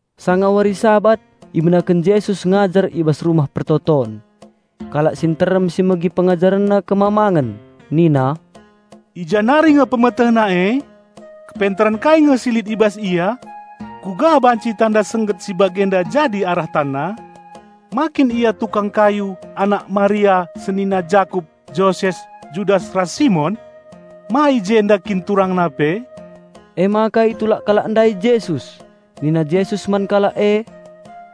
Sanga wari Sabat ibenaken Jesus ngajar i bas rumah persembahen. Kalak si nterem si megi PengajarenNa kemamangen, nina, "I ja nari nge PemetehNa e? Kepentaren kai nge si lit i bas Ia? Kuga banci tanda sengget si bagenda jadi arah TanNa? Ma kin Ia tukang kayu, anak Maria, senina Jakup, Joses, Judas ras Simon? Ma i jenda kin TurangNa pe?" Emaka itulak kalak ndai Jesus. Nina Jesus man kalak e,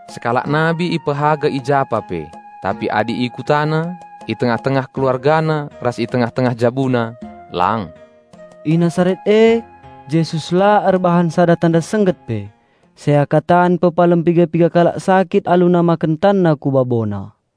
"Sekalak nabi ipehaga i japa pe, tapi adi ikutana, i tengah-tengah keluargana ras i tengah-tengah jabuna, lang." I Nasaret e, Yesus la erbahan sada tanda sengget pe, seakatan pepalem piga-piga kalak sakit alu namaken TanNa ku babona.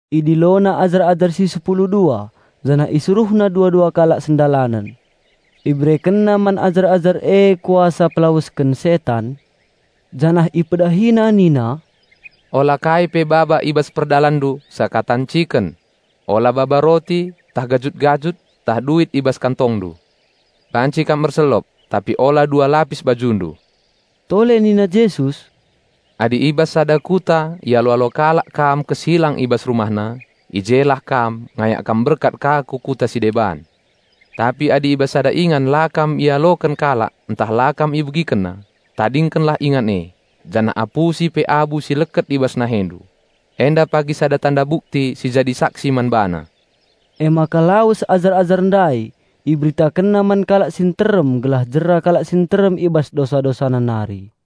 IdiloNa ajar-ajar si sepulu dua, janah IsuruhNa dua-dua kalak sendalanen. IberekenNa man ajar-ajar e kuasa pelawesken setan, janah IpedahiNa nina, "Ola kai pe baba i bas perdalanndu seakatan ciken. Ola baba roti, ntah gajut-gajut, ntah duit i bas kantongndu. Banci kam erselop, tapi ola dua lapis bajundu." Tole nina Jesus, "Adi i bas sada kuta ialo-alo kalak kam kesilang i bas rumahna, i jelah kam ngayak kam berkat ka ku kuta si deban. Tapi adi i bas sada ingan la kam ialoken kalak ntah la kam ibegikenna, tadingkenlah ingan e, janah apusi pe abu si leket i bas nahendu. Enda pagi sada tanda bukti si jadi saksi man bana." Emaka lawes ajar-ajar ndai, iberitakenna man kalak si nterem gelah jera kalak si nterem i bas dosa-dosana nari.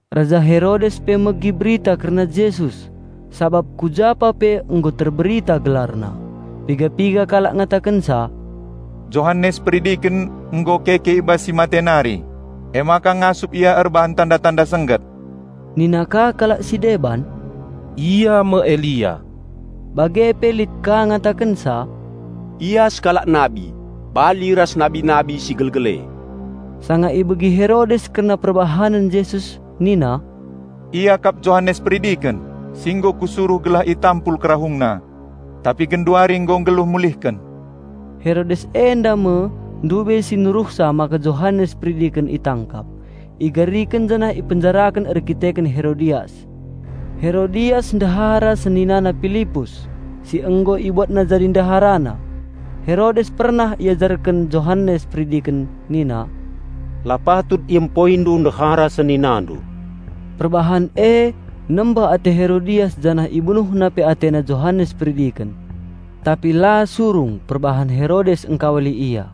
Raja Herodes pe megi berita kerna Jesus, sabap ku japa pe nggo terberita GelarNa. Piga-piga kalak ngatakenca, "Johanes Peridiken nggo keke i bas si mate nari, emaka ngasup Ia erbahan tanda-tanda sengget." Nina ka kalak si deban, "Ia me Elia." Bage pe lit ka ngatakenca, "Ia sekalak nabi, bali ras nabi-nabi si gelgel e." Sanga ibegi Herodes kerna perbahanen Jesus nina, "Ia kap Johanes Peridiken, si nggo kusuruh gelah itampul kerahungna. Tapi genduari nggo nggeluh mulihken." Herodes enda me si nuruhsa mbaruenda maka Johanes Peridiken itangkap, igariken janah ipenjaraken erkiteken Herodias. Herodias ndehara seninana Pilipus, si nggo ibuatna jadi ndeharana. Herodes pernah iajarken Johanes Peridiken nina, "La patut iempoindu ndehara seninandu!" Perbahan e nembeh ate Herodias janah ibunuhna pe atena Johanes Peridiken. Tapi la surung perbahan Herodes engkawali ia.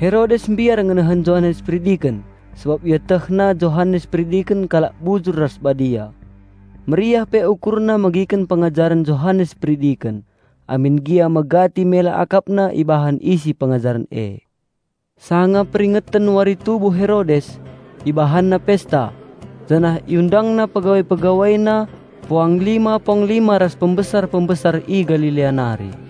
Herodes mbiar ngenehen Johanes Peridiken sabap ietehna Johanes Peridiken kalak bujur ras badia. Meriah pe ukurna megiken pengajaren Johanes Peridiken, amin gia megati ia terpukul ibahan isi pengajaren e. Sanga peringeten wari tubuh Herodes, ibahanna pesta, janah iundangna pegawai-pegawaina, puanglima-puanglima ras pembesar-pembesar i Galilea nari.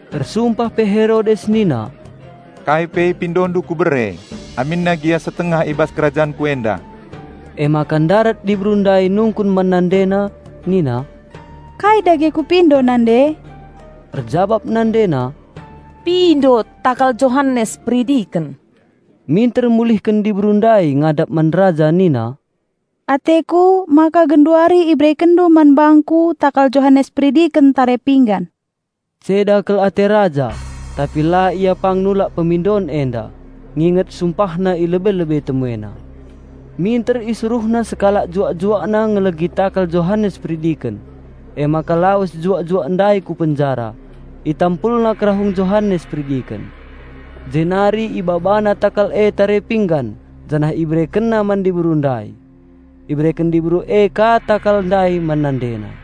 Ersumpah pe Herodes nina, "Kai pe ipindondu kubere, aminna gia setengah i bas kerajanku enda!" Emaka ndarat diberu ndai nungkun man nandena nina, "Kai dage kupindo nande?" Erjabap nandena, "Pindo takal Johanes Peridiken." Minter mulihken diberu ndai ngadap man raja nina, "Ateku maka genduari iberekenndu man bangku takal Johanes Peridiken tare pinggan." Ceda kal ate raja, tapi la ia pang nulak pemindon enda, nginget sumpahna i lebe-lebe temuena. Minter isuruhna sekalak juak-juakna ngelegi takal Johanes Peridiken. Emaka lawes juak-juak ndai ku penjara, itampulna kerahung Johanes Peridiken, jenari ibabana takal e tare pinggan, janah iberekenna man diberu ndai. Ibereken diberu e ka takal ndai man nandena.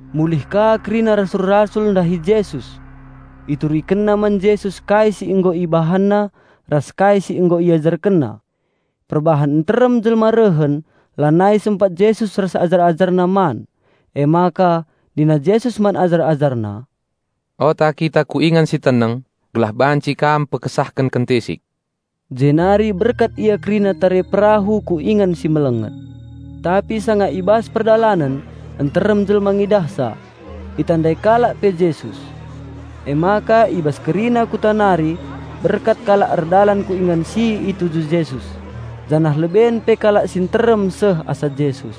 Mulih ka kerina rasul-rasul ndahi Jesus. Iturikenna man Jesus kai si nggo ibahanna ras kai si nggo iajarkenna. Perbahan nterem jelma rehen, lanai sempat Jesus ras ajar-AjarNa man. Emaka nina Jesus man ajar-AjarNa, "Ota kita ku ingan si teneng, gelah banci kam istirahat kentisik." Jenari berkat ia kerina tare perahu ku ingan si melenget. Tapi sanga i bas perdalanen, nterem jelma ngidahsa. Itandai kalak pe Jesus. Emaka i bas kerina kuta nari berkat kalak erdalan ku ingan si i tuju Jesus, janah leben pe kalak si nterem seh asa Jesus.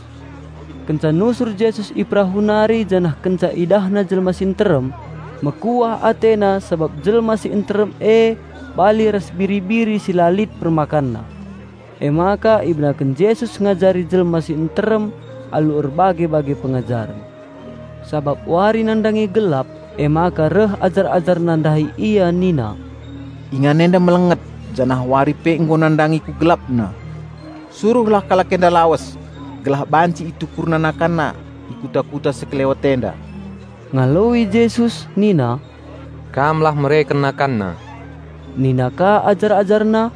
Kenca nusur Jesus i perahu nari janah kenca IdahNa jelma si nterem, mekuah AteNa sabap jelma si nterem e bali ras biri-biri si la lit permakanna. Emaka ibenaken Jesus ngajari jelma si nterem alu erbage-bage pengajaren. Sabap wari nandangi gelap, emaka reh ajar-AjarNa ndahi Ia nina, "Ingan enda melenget, janah wari pe nggo nandangi ku gelapna. Suruhlah kalak enda lawes, gelah banci itukurna nakanna i kuta-kuta sekelewet enda." Ngaloi Jesus nina, "Kam lah mereken nakanna." Nina ka ajar-AjarNa,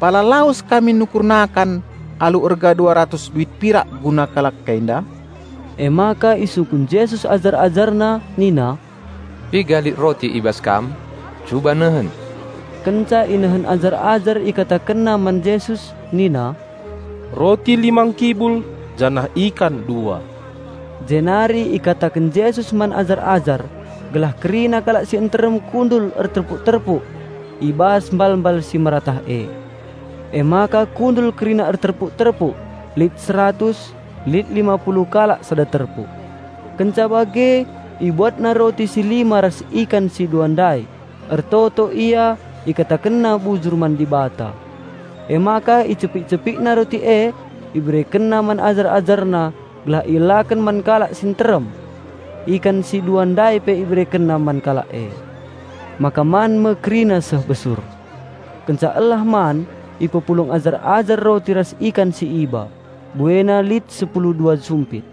"Pala lawes kami nukur nakan alu erga dua ratus duit pirak guna kalak enda?" Emaka isungkun Jesus ajar-AjarNa nina, "Piga lit roti i bas kam? Cuba nehen!" Kenca inehen ajar-ajar ikatakenna man Jesus nina, "Roti lima ngkibul, janah ikan dua." Jenari ikataken Jesus man ajar-ajar, gelah kerina kalak si nterem kundul erterpuk-terpuk i bas mbalmbal si meratah e. Emaka kundul kerina erterpuk-terpuk, lit seratus, lit lima puluh kalak sada terpuk. Kenca bage IbuatNa roti si lima ras ikan si dua ndai, ertoto Ia IkatakenNa bujur man Dibata. Emaka icepik-CepikNa roti e, IberekenNa man ajar-AjarNa gelah ielaken man kalak si nterem. Ikan si dua ndai pe IberekenNa man kalak e. Maka man me kerina seh besur. Kenca elah man, ipepulung ajar-ajar roti ras ikan si iba, buena lit sepulu dua sumpit.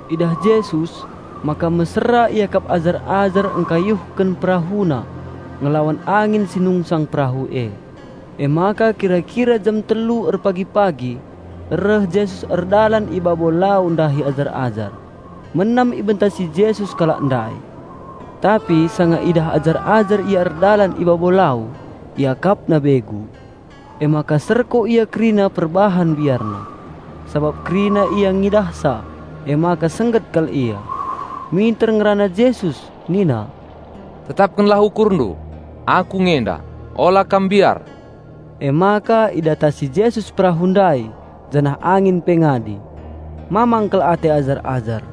Idah Jesus maka mesera iakap ajar-ajar engkayuhken perahuna ngelawan angin si nungsang perahu e, emaka kira-kira jam telu erpagi-pagi reh Jesus erdalan i babo lau ndahi ajar-ajar; menam ibentasi Jesus kalak ndai. Tapi sanga idah ajar-ajar Ia erdalan i babo lau, iakapna begu, emaka serko ia kerina perbahan biarna. Sabap kerina ia ngidahsa emaka sengget kal ia. Minter ngerana Jesus nina, "Tetapkenlah, ukurndu! Aku nge enda, ola kam mbiar." Emaka idatasi Jesus perahu ndai, janah angin pe ngadi. Mamang kal ate ajar-ajar,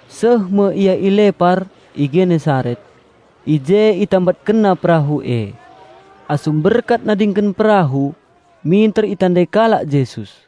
Seh me ia i lepar, i Genesaret. I je itambatkenna perahu e. Asum berkat nadingken perahu, minter itandai kalak Jesus.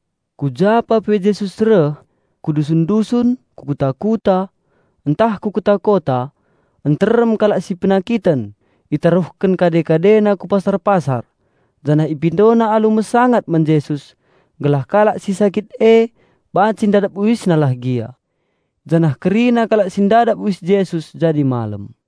Ku ja pa pe Jesus reh, ku dusun-dusun, ku kuta-kuta, ntah ku kota-kota, nterem kalak si penakiten itaruhken kade-kadena ku pasar-pasar janah ipindona alu mesangat man Jesus gelah kalak si sakit e banci ndadap UisNa lah gia. Janah kerina kalak si ndadap uis Jesus jadi malem.